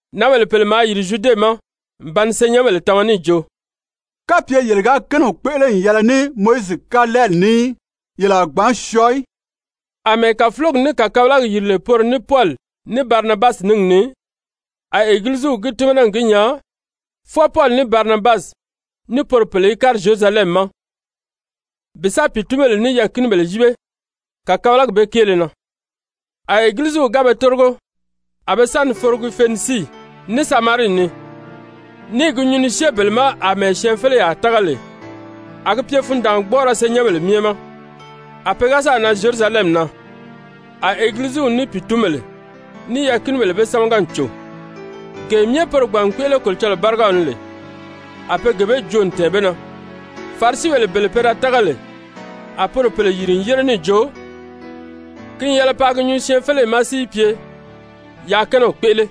Nǎnbèle pèle maa yìri Zyude ma n ba ni senyɛnbèle tama níì jo: «Kapye yele ga kɛ́nɛw kpéʔele n yɛlɛ ní Mowizi kalɛɛli ní í, yele a gbǎn syɔɔ í.» Amɛɛ kàfulogi ní kàkabalagi yìri lè poro ní Pɔli ní Barinabasi níngi ni, a Egiliziw gi tímana n gi nyaa fwɔɔ Pɔli ní Barinabasi, ní poro pèle í kári Zyerusalɛmi ma bi sa pìitunbèle ní yɛɛ̀kinibèle yíbe kàkabalagi bee kéele na. A Egiliziw ga be tórigo, a be sa ni forogi Fenisii, ní Samarii ni, ní i gi nyuu ni syée bele ma àmɛɛ syɛɛnfeleyaa tága lè. A gi pye fundaangbɔɔrɔ senyɛnbèle myɛ ma. A pe ga sáà nan Zyerusalɛmi na, a Egiliziw ní pìitunbèle, ní yɛɛ̀kinibèle be sámaga n cò, gee myɛ poro gbàn n kpéʔele Kolocɔlɔɔ bárigaw ni lè, a be gee bee joo n tɛ̀ɛn be na. Farisibèle bele pe da tága lè, a poro pèle yìri n yére níì jo, ki n yɛlɛ paa gi nyuu syɛɛnfeleyi ma si yi pye, yaa kɛ́nɛw kpéʔele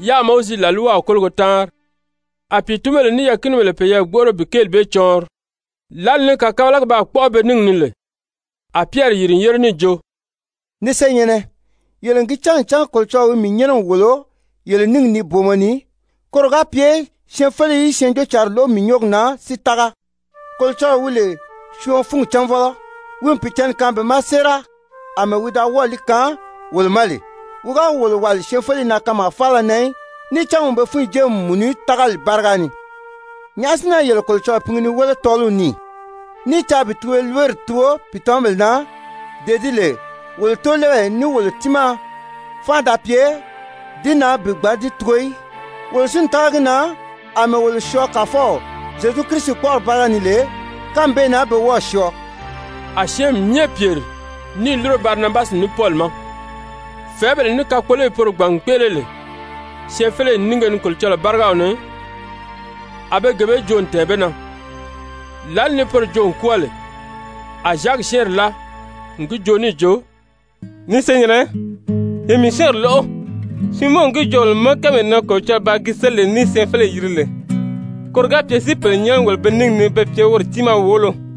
yáā Mowizi làlwaw kólogo táanri. A pìitunbèle ní yɛɛ̀kinibèle peyɛɛ gbóʔoro bi kéeli bee cɔɔnri. Lǎli ni kàkabagi baa kpɔ́ʔɔ be níngi ni lè, a Pyɛri yìri n yére níì jo: «Ni senyɛ̀nnɛ, yele n gi cán ncan Kolocɔlɔɔ wi mii nyɛ́nɛ n wòlo yele níngi ni booma ni, koro ga pye syɛɛnfeleyi í Syɛɛnjóocǎnri lóʔo mii nyɔ́ɔgi na si tága. Kolocɔlɔɔ wi lè syɔɔn fúngi cánvɔlɔ, wi n Pìicǎnni kaan be ma séera, àmɛɛ wi da wɔ́ɔ̀ li kaan wolo ma lè. Wi ga wolo wàli syɛɛnfeleyi na kanmaa faala na í, níì cán wi n be fúnyi jée n mùnu tágali báriga ni. Nyàʔá si na yele Kolocɔlɔɔ pingi ni wéle tɔ́ɔliw ni, ní i caa bi tugoliberi tugo pìitamabèle na, dee di lè wolo tóolɛɛbèle ní wolo tiimaa fánʔa da pye di na bi gbǎn di tugo í? Wolo si n tága gi na àmɛɛ wolo syɔɔ Kàfɔw Zyezu kpɔ́ʔɔri báriga ni lè, kánmi bee na be wɔ́ɔ̀ syɔɔ.» A syɛ́ɛnmi myɛ pyèri ní i lúro Barinabasi ní Pɔli ma, fɛ̀ɛ́bèle ní kakpoloyi poro gbàn n kpéʔele lè syɛɛnfeleyi nínge ni Kolocɔlɔɔ bárigaw ni, a be gee bee myɛ joo n tɛ̀ɛn be na. Lǎli ni poro joo n kwɔ́ɔ lè, a Zyaki syɛ́ɛnri láa n gi joo níì jo: «Ni senyɛ̀nnɛ, ye mii syɛ́ɛnri lóʔo! Siimɔn n gi joo wolo ma kánmee na Kolocɔlɔɔ baa gi séli ni syɛɛnfeleyi yiri lè, koro ga pye si pèle nyɛ́nɛ wòlo be níngi ni be pye woro tiimaa wòolo.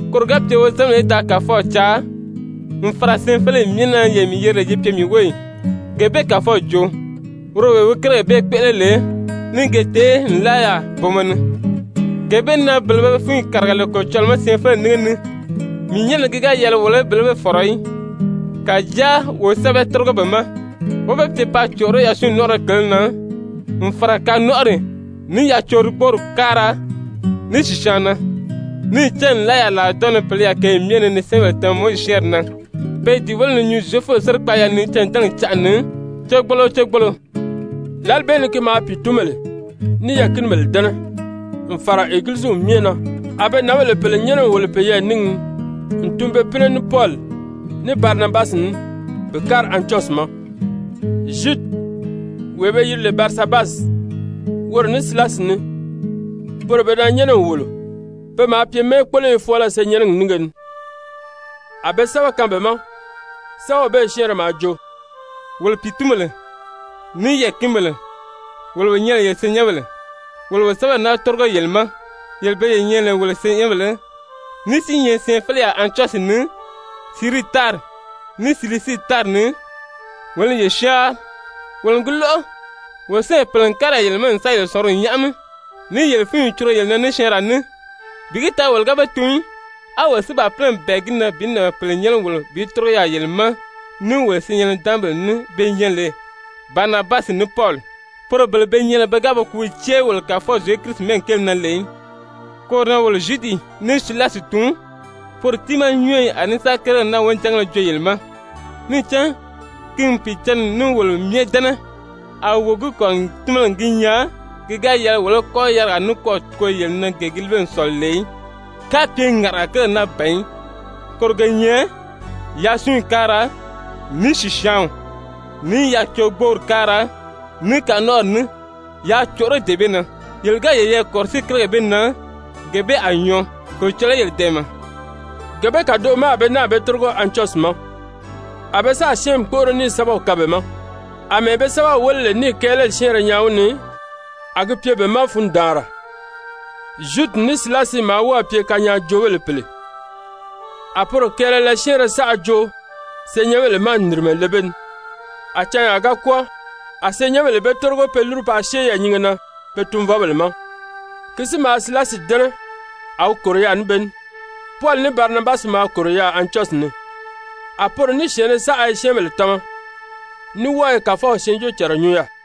Koro ga pye wozanbèle í da Kàfɔw caa, n fàra syɛɛnfeleyi myɛ na yee mii yeri lè yi pye mii wóyi,› gee bee Kàfɔw joo, woro wee wi kérigèle bee kpéʔele lè, ní i ge tèé nlaa yaà booma ni. Gee bee na bele be be fúnyi kàriga lè Kolocɔlɔɔ ma syɛɛnfeleyi nínge ni, mii nyɛ́nɛ na ki ga yɛlɛ wo bele bee fɔ̀rɔ í. Kàjáa wo sɛ́bɛ tórigo be ma, wó be pye paa còʔoró yasunyi nɔ́nʔɔrɔ kele na, n fàra kanɔnʔɔri, ní yacorigboori káara, ní sìsyaanw na. Níì cán nlaa yaà làridɔɔnnɔ ni pèle i yaà kěyi myɛ ni ni syɛ́ɛnbèle tama Mowizi syɛ́ɛnri na, pe i di wéle ni nyuu Zyefubèle sérikpaaya ni cândɛnɛgi canʔa ni, cégbolo o cégbolo.» Lǎli bee ni ki maa pìitunbèle, ní yɛɛ̀kinibèle dɛ́nɛ, n fàra Egiliziw myɛ na, a be nǎnbèle pèle nyɛ́nɛ n wòlo peyɛɛ níngi ni n tun be pínɛ ní Pɔli, ní Barinabasi ní bi kári Antyɔsyi ma, Zyudi wee be yiri lè Barisabasi, woro ní Silasi ní, poro pe da nyɛ́nɛ n wòlo, pe maa pye mɛ́ɛkpoloyo fɔɔlɔ senyɛnnɛgi nínge ni. A be sɛ́bɛ kaan be ma, sɛ́bɛw bee syɛ́ɛnrɛ maa jo: «Wolo pìitunbèle, ní yɛɛ̀kinibèle, wolo wo nyɛ lè yele senyɛnbèle, wolo wo sɛ́bɛw naa tórigo yele ma, yele bele ye nyɛ lè wolo senyɛnbèle, ní si i nyɛ syɛɛnfeleyaa Antyɔsyi ni, Sirii tári, ní Silisii tári ni, wolo i yele syáanri! Wolo n gi lóʔo, wolo syɛ́ɛnbèle pèle n kári yaà yele ma n sáà yele sɔ̀nguri nyáʔami, níì yele fúnyi curugo yele na ní syɛɛnraa ní, bi gi taa wolo ga be tun í. A wolo si baa pínɛ n bɛ̀ɛ gi na bi nǎnbèle pèle nyɛ́nɛ wòlo bi tórigo yaà yele ma ní wolo syɛɛn-nidaanmabèle ní be nyɛ lè Barinabasi ní Pɔli, poro bele be nyɛ lè pe ga be kùúw cée í wolo Kàfɔw Zyezu Kirisi mɛ́ɛgi kéele na lè í. Koro na wolo Zyudi ní Silasi tun, poro tiimaa nyɔ́ɔyi a ní sa kérigèle naa wonijangéle joo yele ma. Níì cán ki n Pìicǎnni ní wolo myɛ dɛ́nɛ, a wo gi kɔ̀rirɔ n tímana n gi nyaa ki ga yɛlɛ wolo í kɔ́ yarigaa nikwɔɔ tugo yele na gee gi líbe n sɔ̀lɔ lè í, kapye ŋàʔanaga kérigèle naa ban í, koro ge nyɛ: Yasunyi káara, ní sìsyaanw, ní yacorigboori káara, ní kanɔnʔɔri ní, yaa còʔoró dee bee na. Yele ga yeyɛɛ kɔ̀rɔsíi kérigèle bee na, gee bee a nyɔɔ. Kolocɔlɔɔ í yele dɛ̀ɛmɛ.» Gee bee kàdoʔo ma a be náà be tórigo Antyɔsyi ma, a be sáà syɛ́ɛnmi kpóʔoro níì sɛ́bɛw kaan be ma. Amɛɛ be sɛ́bɛw wéle lè níì kɛɛlɛli syɛ́ɛnrɛ nyaa wi ni, a gi pye be ma fundaanra. Zyudi ní Silasi maa wɔ́ɔ̀ pye kanyaajoobèle pèle, a poro kɛɛlɛlɛ syɛ́ɛnrɛ saʔa joo senyɛnbèle ma n nìrimɛ le be ni. A canyaa ga kwɔ́ɔ, a senyɛnbèle be tórigo pe lúru paa syée yɛɛ̀nyinge na be tunvɔbèle ma. [Ki si maa Silasi dɛ́nɛ, a wi kòro yaà ní be ní.] Pɔli ní Barinabasi maa kòro yaà Antyɔsyi ni, a poro ní syɛ̀ɛnnɛ saʔa i syɛ́ɛnbèle tama, ní wɔ́ɔ i Kàfɔw syɛɛnjóocànra nyuu yaà.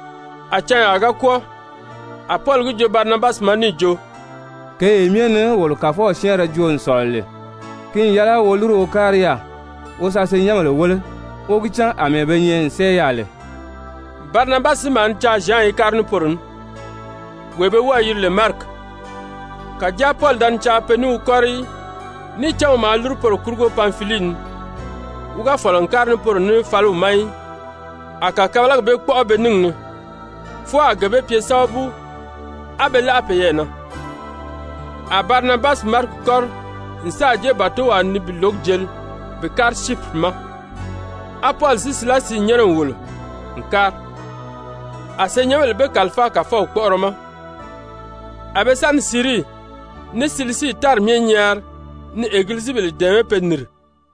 A canyaa ga kwɔ́ɔ, a Pɔli gi joo Barinabasi ma níì jo: «Kěyee myɛ ni wolo Kàfɔw syɛ́ɛnrɛ joo n sɔ̀lɔ lè, ki n yɛlɛ wo lúru wo kári yaà wo sa senyɛnbèle wéle, wó gi cán àmɛɛ be nyɛ n sɛ́ɛ yaà lè.» Barinabasi si maa ni caa Zyan í kári ní poro ní, wee be wɔ́ɔ̄ yiri lè Mariki. Kàjáa Pɔli da ni caa pe ní wi kɔ́ri í, níì cán wi maa lúru poro kurugo Panfilii ni, wi ga fɔ̀lɔ n kári ní poro ní fáliw ma í. A kàkabalagi bee kpɔ́ʔɔ be níngi ni, fwɔɔ a gee bee pye sábabu á be láʔa peyɛɛ na. A Barinabasi Mariki kɔ́ri n sáà jée bàtowaa ni bi lǒgi jeli bi kári Syipiri ma, á Pɔli si Silasi nyɛ́nɛ n wòlo n kári, a senyɛnbèle be kàlifáa Kàfɔw kpɔ́ʔɔrɔ ma. A be sa ni Sirii ní Silisii tári myɛ nyaari ni egilizibèle dɛ̀ɛmɛ́ pe nìri.